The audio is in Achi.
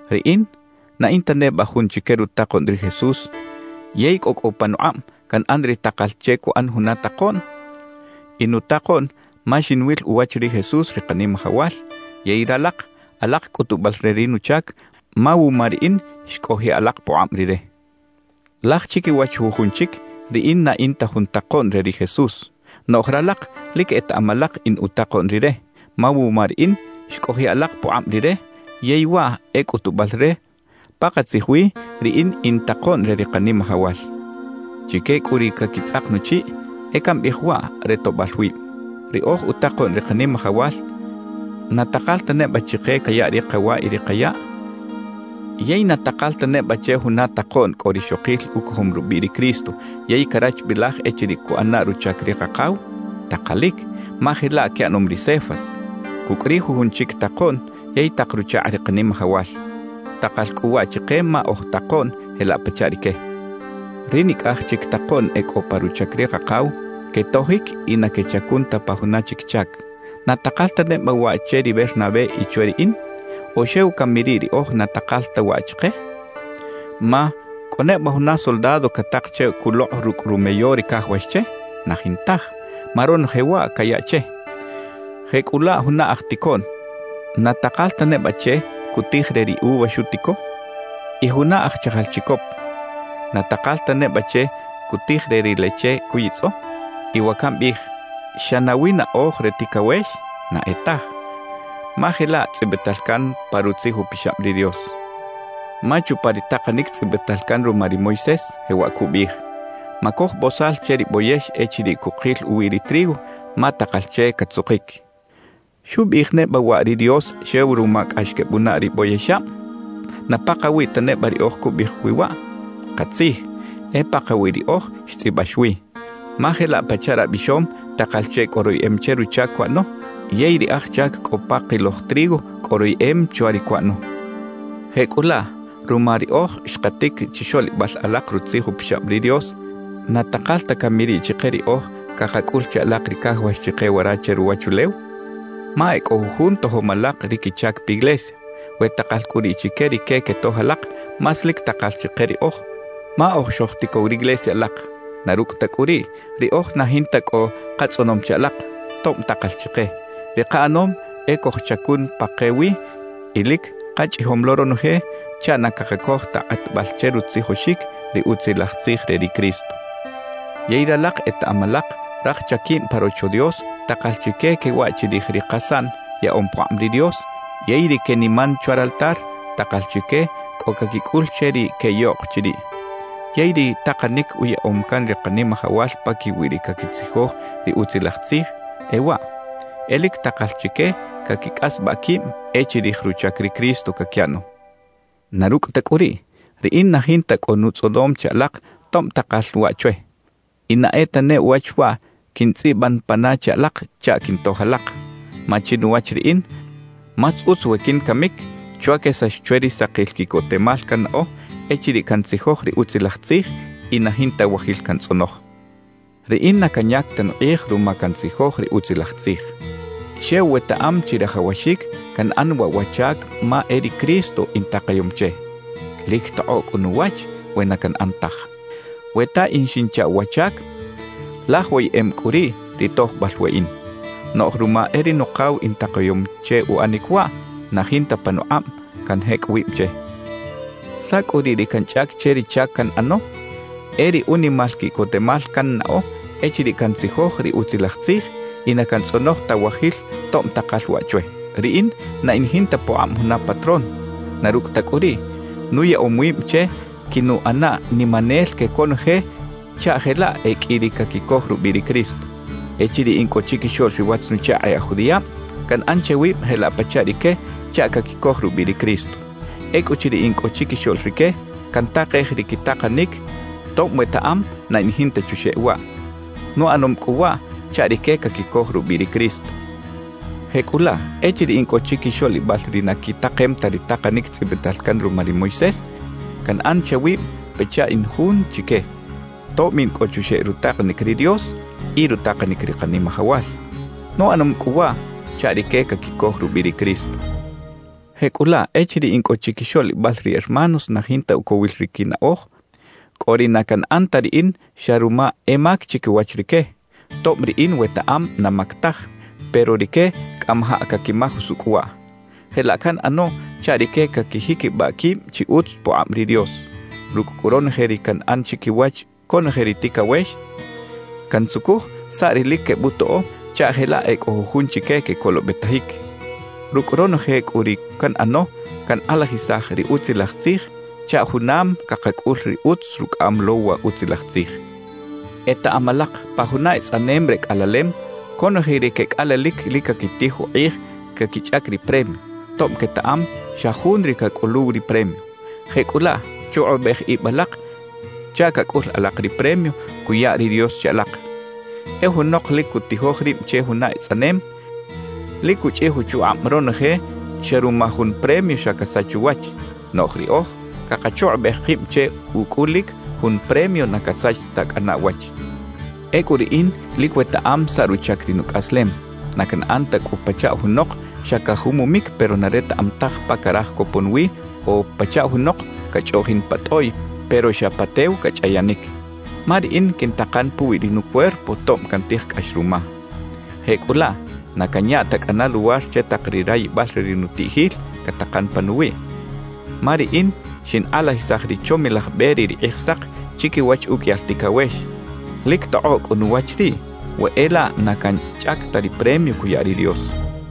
Riꞌin ¿na in ta neba jun chique rutakoꞌn ri Jesús yey cꞌo cꞌu panukꞌab canꞌan ri takal che cuꞌan juna takoꞌn? In utakoꞌn ma xinwil uwach ri Jesús ri Kanimajawal, yey ralak alak cꞌutubal re ri nuchac ma wuma riꞌin xcꞌojiꞌ alak pukꞌab Rire. Laj chiquiwach jujun chic riꞌin na in ta jun takoꞌn re ri Jesús; noꞌj ralak lic etaꞌam alak in utakoꞌn Rire, ma wuma riꞌin xcꞌojiꞌ alak pukꞌab Rire yey waꞌ e cꞌutubal re pakatzij wi riꞌin in takoꞌn re ri Kanimajawal. Chique cꞌu ri caquitzꞌak nuchiꞌ, e cambiꞌij waꞌ re toꞌbal wib: Ri oj utakoꞌn ri Kanimajawal, ¿na takal ta neba chike cayaꞌ ri kawa y ri kayaꞌ? ¿Yey na takal ta neba che juna takoꞌn cꞌo rixokil ucojom rubiꞌ ri Cristo yey carachbilaj echiriꞌ cuꞌana ruchac ri Kakaw? Takalic, ma jelaꞌ quiꞌanom ri Cefas cucꞌ ri jujun chic takoꞌn yey tak ruchakꞌ ri Kanimajawal. Takal cꞌu waꞌ chike ma oj takoꞌn jelaꞌ pachaꞌ rique. Ri nicꞌaj chic takoꞌn e cꞌo pa ruchac ri Kakaw, quetojic y na quechacun ta pa juna chic chac. ¿Na takal ta neba waꞌ che ri Bernabé y chwe riꞌin? ¿O xew cami riꞌ riꞌoj na takal ta waꞌ chike? Ma ¿cꞌo neba juna soldado catak che culokꞌ rucꞌ rumeyo ri cajawax che? Na jintaj, ma ronoje waꞌ cayaꞌ che. Jecꞌulaꞌ juna aj ticoꞌn, ¿na takal ta neba che cutij re ri uva xutico? Y juna aj chajal chicop, ¿na takal ta neba che cutij re ri leche cuyitzꞌo? Y wa cambiꞌij, ¿xa nawi naꞌoj re ticawex? Na e taj, ma jelaꞌ tzꞌibital can pa Rutzij Upixab ri Dios. Ma chupa ri takanic tzꞌibital can ruma ri Moisés, jewaꞌ cubiꞌij: «Macoj bozal che ri boyex echiriꞌ cukil uwi ri trigo, ma takal che catzukic.» ¿Xubiꞌij neba waꞌ ri Dios xew ruma cꞌax quebunaꞌ ri boyexab? ¿Na pakawiꞌ ta neba riꞌoj cubiꞌij wi waꞌ? Katzij, e pakawiꞌ riꞌoj xtzꞌibax wi. Ma jelaꞌ pachaꞌ rabixom takal che cꞌo royeꞌem che ruchac cuꞌano; yey ri aj chac cꞌo pa kiloj trigo cꞌo royeꞌem chwa ri cuꞌano; jecꞌulaꞌ ruma riꞌoj xkatic chixoꞌlibal alak Rutzij Upixab ri Dios, ¿na takal ta cami riꞌ chike riꞌoj cakacꞌul che alak ri cajawax chike wara che ruwachulew? Ma e cꞌo jujun tojom alak ri quichac piglesia. We takal cꞌu riꞌ chique rique quetoj alak, más lic takal chike riꞌoj, ma oj xojticow riglesia alak. Na rucꞌ ta cꞌu riꞌ, riꞌoj na jinta cꞌo katzꞌonom che alak, tob takal chike. Ri kaꞌanom e cojchacun pa ke wi y lic kachꞌijom lo ronoje chaꞌ na cakacoj ta kꞌatbal che rutzijoxic ri Utzilaj Tzij re ri Cristo. Yey ralak etaꞌam alak raj chaquib pa Rocho Dios takal chique quewaꞌ chirij ri kasaꞌn yaꞌom pukꞌab ri Dios; yey ri queniman chwa raltar, takal chique cꞌo caquicꞌul che ri queꞌyoꞌk chiriꞌ. Yey ri takanic uyaꞌom can ri Kanimajawal paquiwi ri caquitzijoj ri Utzilaj Tzij, e waꞌ: E lic takal chique caquicꞌasbaꞌ quib e chirij ruchac ri Cristo caquiꞌano. Na rucꞌ ta cꞌu riꞌ, riꞌin na jinta cꞌo nutzꞌonom che alak tob takal waꞌ chwe. Y na e tane uwach waꞌ quintzꞌiban pana che alak chaꞌ quintoj alak. Ma chinuwach riꞌin, más utz we quincamic chwa quesax chwe ri sakil quiꞌcotemal cannaꞌo echiriꞌ cantzijoj ri Utzilaj Tzij y na jinta wajil cantzꞌonoj. Riꞌin na canyac ta nukꞌij ruma cantzijoj ri Utzilaj Tzij. Xew wetaꞌam chirajawaxic canꞌan waꞌ wa chac ma e ri Cristo intakayom che. ¡Lic tokꞌoꞌ cꞌu nuwach we na canꞌan taj! We ta in xinchaꞌw wa chac, laj woyeꞌem cꞌu riꞌ ri tojbal weꞌin. Noꞌj ruma e ri Nukaw intakayom che uꞌanic waꞌ, na jinta panukꞌab canjecꞌ wib che. ¿Saꞌ cꞌu ri canchꞌac che ri chac canꞌano? E ri unimal quiꞌcotemal cannaꞌo echiriꞌ cantzijoj ri Utzilaj Tzij y na cantzꞌonoj ta wajil tob takal waꞌ chwe. Riꞌin na in jinta pukꞌab juna patrón; na rucꞌ ta cꞌu riꞌ, nuyaꞌom wib che quinuꞌana nimanel que conoje chaꞌ jelaꞌ e qꞌui ri caquicoj rubiꞌ ri Cristo. Echiriꞌ in cꞌo chiquixoꞌl ri watz-nuchakꞌ e aj judiꞌab, canꞌan che wib jelaꞌ pachaꞌ rique chaꞌ caquicoj rubiꞌ ri Cristo. Ecꞌuchiriꞌ in cꞌo chiquixoꞌl rique, cantakej ri quitakanic, tob wetaꞌam na in jinta chuxeꞌ waꞌ. Nuꞌanom cꞌu waꞌ chaꞌ rique caquicoj rubiꞌ ri Cristo. Jecꞌulaꞌ echiriꞌ in cꞌo chiquixoꞌlibal ri na quitakem ta ri takanic tzꞌibital can ruma ri Moisés, canꞌan che wib pachaꞌ in jun chique, tob in cꞌo chuxeꞌ rutakanic ri Dios y rutakanic ri Kanimajawal. Nuꞌanom cꞌu waꞌ chaꞌ rique caquicoj rubiꞌ ri Cristo. Jecꞌulaꞌ echiriꞌ in cꞌo chiquixoꞌlibal ri hermanos na jinta ucowil ri quinaꞌoj, cꞌo ri na canꞌan ta riꞌin xa ruma e mac chiquiwach rique, tob riꞌin wetaꞌam na mac taj, pero rique cꞌamajaꞌ caquimaj usucꞌ waꞌ. Jelaꞌ canꞌano chaꞌ rique caquijiquibaꞌ quib chi utz pukꞌab ri Dios. Rucꞌ cꞌu ronoje ri canꞌan chiquiwach conoje ri ticawex, cantzucuj saꞌ ri lic quebutoꞌo chaꞌ jelaꞌ e cꞌo jujun chique quecolobetajic. Rucꞌ ronoje cꞌu ri canꞌano, cankꞌalajisaj ri Utzilaj Tzij chaꞌ junam cakacꞌul ri utz rucꞌaꞌam lo wa Utzilaj Tzij. Etaꞌam alak pa juna etzꞌanem re cꞌalalem, conoje ri quecꞌalalic lic caquitij ukꞌij caquichꞌac ri premio, tob quetaꞌam xa jun ri cacꞌuluw ri premio. Jecꞌulaꞌ chukꞌubej ib alak chaꞌ cacꞌul alak ri premio cuya ri Dios che alak. E junok lic cutijoj rib che juna etzꞌanem, lic cuchꞌij uchukꞌab ronoje xa ruma jun premio xa casach uwach. Noꞌj riꞌoj cakachukꞌubej kib che ucꞌulic jun premio na casach ta cꞌana uwach. Ecꞌu riꞌin lic wetaꞌam saꞌ ruchac ri nucꞌaslem. Na canꞌan ta cꞌu pachaꞌ junok xa cajumumic pero na retaꞌam taj pa caraj copon wi o pachaꞌ junok cachꞌoꞌjin pa tꞌoꞌy pero xa pa tew cachꞌayanic. Ma riꞌin quintakan puwi ri nucuerpo tob cantij cꞌax ruma. Jecꞌulaꞌ na canya ta cꞌana luwar che tak ri rayibal re ri nutiꞌjil catakan panuwiꞌ. Ma riꞌin xinkꞌalajisaj ri chomilaj be re ri Kꞌijsak chiquiwach uqꞌuiyal ticawex; lic tokꞌoꞌ cꞌu nuwach riꞌ we e laꞌ na canchꞌac ta ri premio cuya ri Dios.